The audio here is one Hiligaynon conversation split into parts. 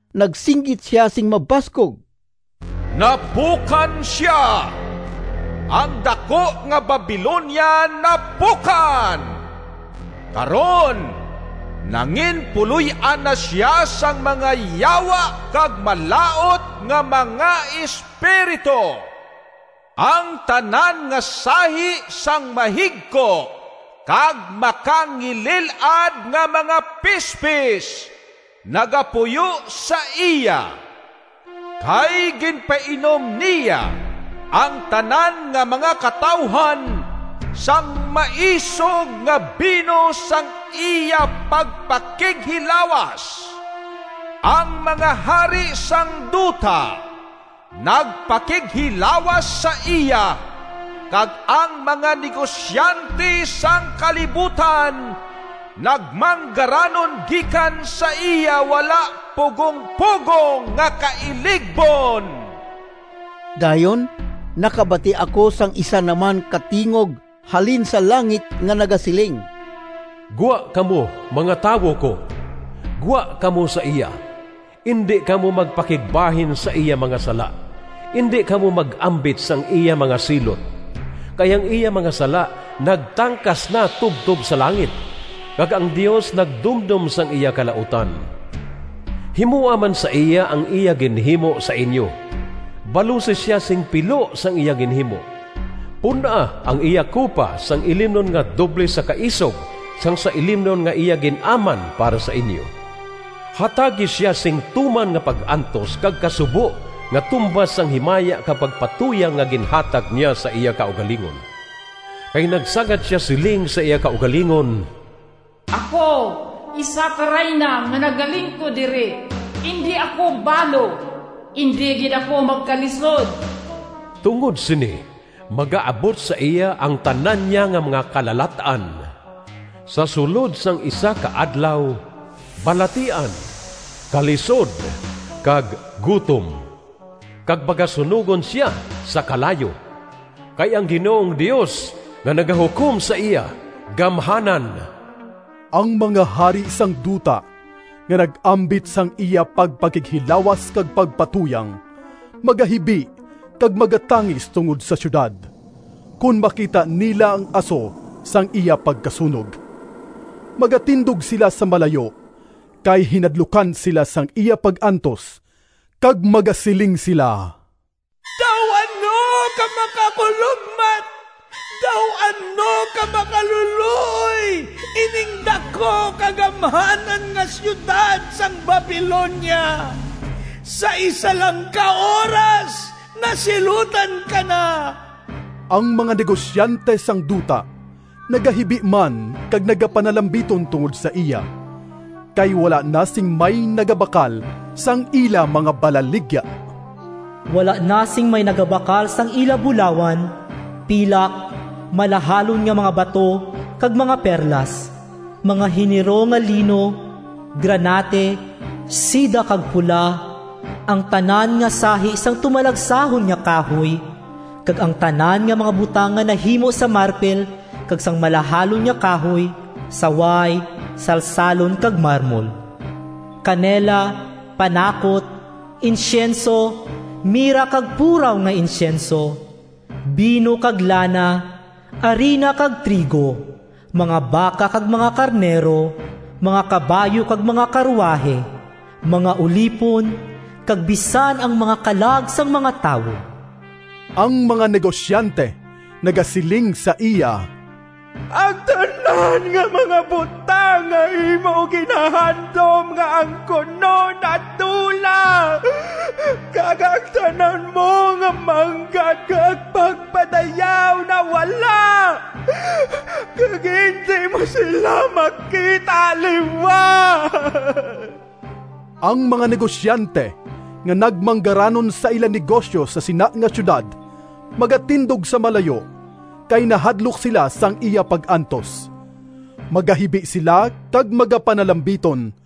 Nagsinggit sia sing mabaskog, “Napukan sia! Ang daku nga Babilonia napukan! Karon nanginpuloy-an na sia sang mga yawa kag malaut nga mga espiritu. Ang tanan nga sahi sang mahigko kag makangilil-ad nga mga pispis nagapuyo sa iya. Kay ginpainom niya ang tanan nga mga katawuhan sang maisog nga bino sang iya pagpakighilawas. Ang mga hari sang duta nagpakighilawas sa iya, kag ang mga negosyante sang kalibutan nagmanggaranon gikan sa iya wala pugong-pugong nga kailigbon.” Dayon nakabati ako sang isa naman ka tingog halin sa langit nga nagasiling: “Gwa kamo, nga tawo ko! Gwa kamo sa iya! Indi kamo magpakigbahin Sa iya mga sala, Indi kamo mag-ambit Sang iya mga silot! Kay ang iya mga sala Nagtangkas na tubtob sa langit, Kag ang Dios nagdumdom Sang iya kalautan. Himoa man sa iya Ang iya ginhimo sa inyo, Balusi sia sing pilo Sang iya ginhimo. Pun-a ang iya kupa Sang ilimnon nga doble sa kaisog Sang sa ilimnon Nga iya gin-aman para sa inyo. Hatagi sia Sing tuman nga pag-antos kag kasubo Nga tumbas sang himaya Kag pagpatuyang Nga ginhatag niya Sa iya kaugalingon. Kay nagsagad sia Siling sa iya kaugalingon: ‘Ako isa ka rayna Nga nagalingkod diri! Indi ako balo, Indi gid ako magkalisod!’ Tungod sini magaabot sa iya Ang tanan niya nga mga kalalat-an Sa sulod sang isa ka adlaw: Balatian, kalisod, kag gutom. Kag pagasunogon sia sa kalayo, Kay ang Ginoong Dios Nga nagahukom sa iya gamhanan.” Ang mga hari sang duta nga nag-ambit sang iya pagpakighilawas kag pagpatuyang, magahibi kag magatangis tungod sa siyudad, kon makita nila ang aso sang iya pagkasunog. Magatindog sila sa malayo, kay hinadlukan sila sang iya pag-antos, kag magasiling sila, “Daw ano ka makakulogmat! Daw ano ka makalulooy ining daku kag gamhanan nga siyudad sang Babilonia! Sa isa lang ka oras nasilutan ka na!” Ang mga negosyante sang duta nagahibi man kag nagapanalambiton tungod sa iya, kay wala na sing may nagabakal sang ila mga balaligya. Wala na sing may nagabakal sang ila bulawan, pilak, malahalon nga mga bato, kag mga perlas; mga hinero nga lino, granate, seda, kag pula; ang tanan nga sahi sang tumalagsahon nga kahoy, kag ang tanan nga mga butang nga nahimo sa marpil kag sang malahalon nga kahoy, saway, salsalon, kag marmol; kanela, panakot, insyenso, mira kag puraw nga insyenso; bino kag lana, arina kag trigo, mga baka kag mga karnero, mga kabayo kag mga karuwahi, mga ulipon kag bisan ang mga kalag sang mga tawo. Ang mga negosyante nagasiling sa iya, “Ang tanan nga mga butang nga imo ginahandom nga angkunon nadula kag ang tanan mo nga manggad kag pagpadayaw nawala, kag indi mo sila makita liwat!” Ang mga negosyante nga nagmanggaranon sa ila negosyo sa sina nga siyudad, magatindog sa malayo, kay nahadlok sila sang iya pag-antos. Magahibi sila kag magapanalambiton,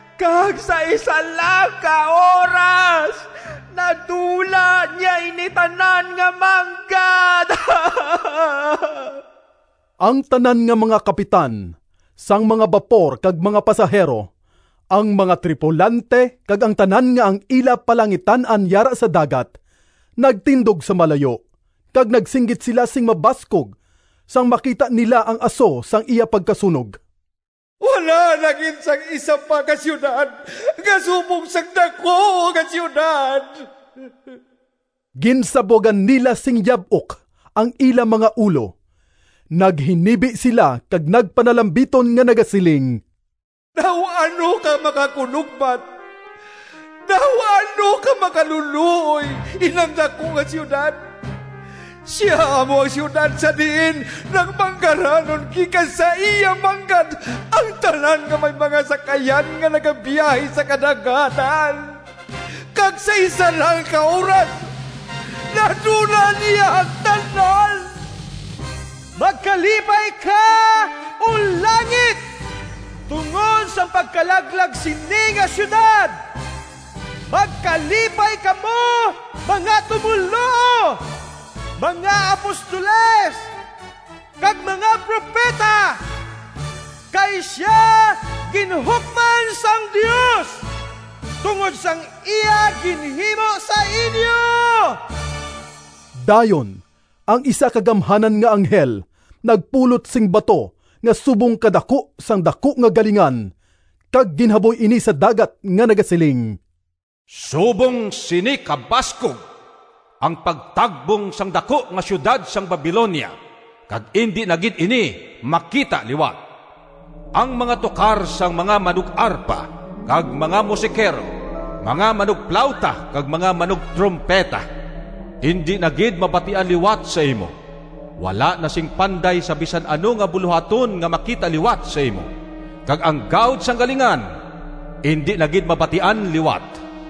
Kag sa isa lang ka oras nadula niya ini tanan nga manggad!” Ang tanan nga mga kapitan sang mga bapor kag mga pasahero, ang mga tripulante kag ang tanan nga ang ila palangitan-an yara sa dagat, nagtindog sa malayo, kag nagsinggit sila sing mabaskog sang makita nila ang aso sang iya pagkasunog, “Wala na gid sing isa pa ka siyudad nga subong sang daku nga siyudad!” Ginsabwagan nila sing yab-ok ang ila mga ulo, naghinibi sila kag nagpanalambiton nga nagasiling, “Daw ano ka makakulogmat! Daw ano ka makalulooy inang daku nga siyudad! Sia amo ang siyudad sa diin nagmanggaranon gikan sa iya manggad ang tanan nga may mga sakayan nga nagabiyahe sa kadagatan! Kag sa isa lang ka oras nadula niya ang tanan!” Magkalipay ka, O langit, tungod sang pagkalaglag sini nga siyudad! Magkalipay kamo, mga tumoluo, mga apostoles kag mga propeta! Kay sia ginhukman sang Dios tungod sang iya ginhimo sa inyo! Dayon ang isa ka gamhanan nga anghel nagpulot sing bato nga subong kadaku sang daku nga galingan, kag ginhaboy ini sa dagat nga nagasiling, “Subong sini kabaskog ang pagtagbong sang daku nga siyudad sang Babilonia kag indi na gid ini makita liwat. Ang mga tukar sang mga manug-arpa kag mga musikero, mga manugplawta kag mga manugtrumpeta, indi na gid mabatian liwat sa imo! Wala na sing panday sa bisan ano nga bulohaton nga makita liwat sa imo, kag ang gahod sang galingan indi na gid mabatian liwat!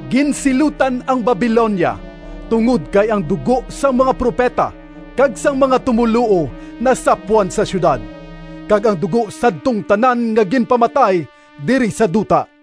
Ginsilutan ang Babilonia tungod kay ang dugo sang mga propeta kag sang mga tumoluo nasapwan sa siyudad, kag ang dugo sadtong tanan nga ginpamatay diri sa duta.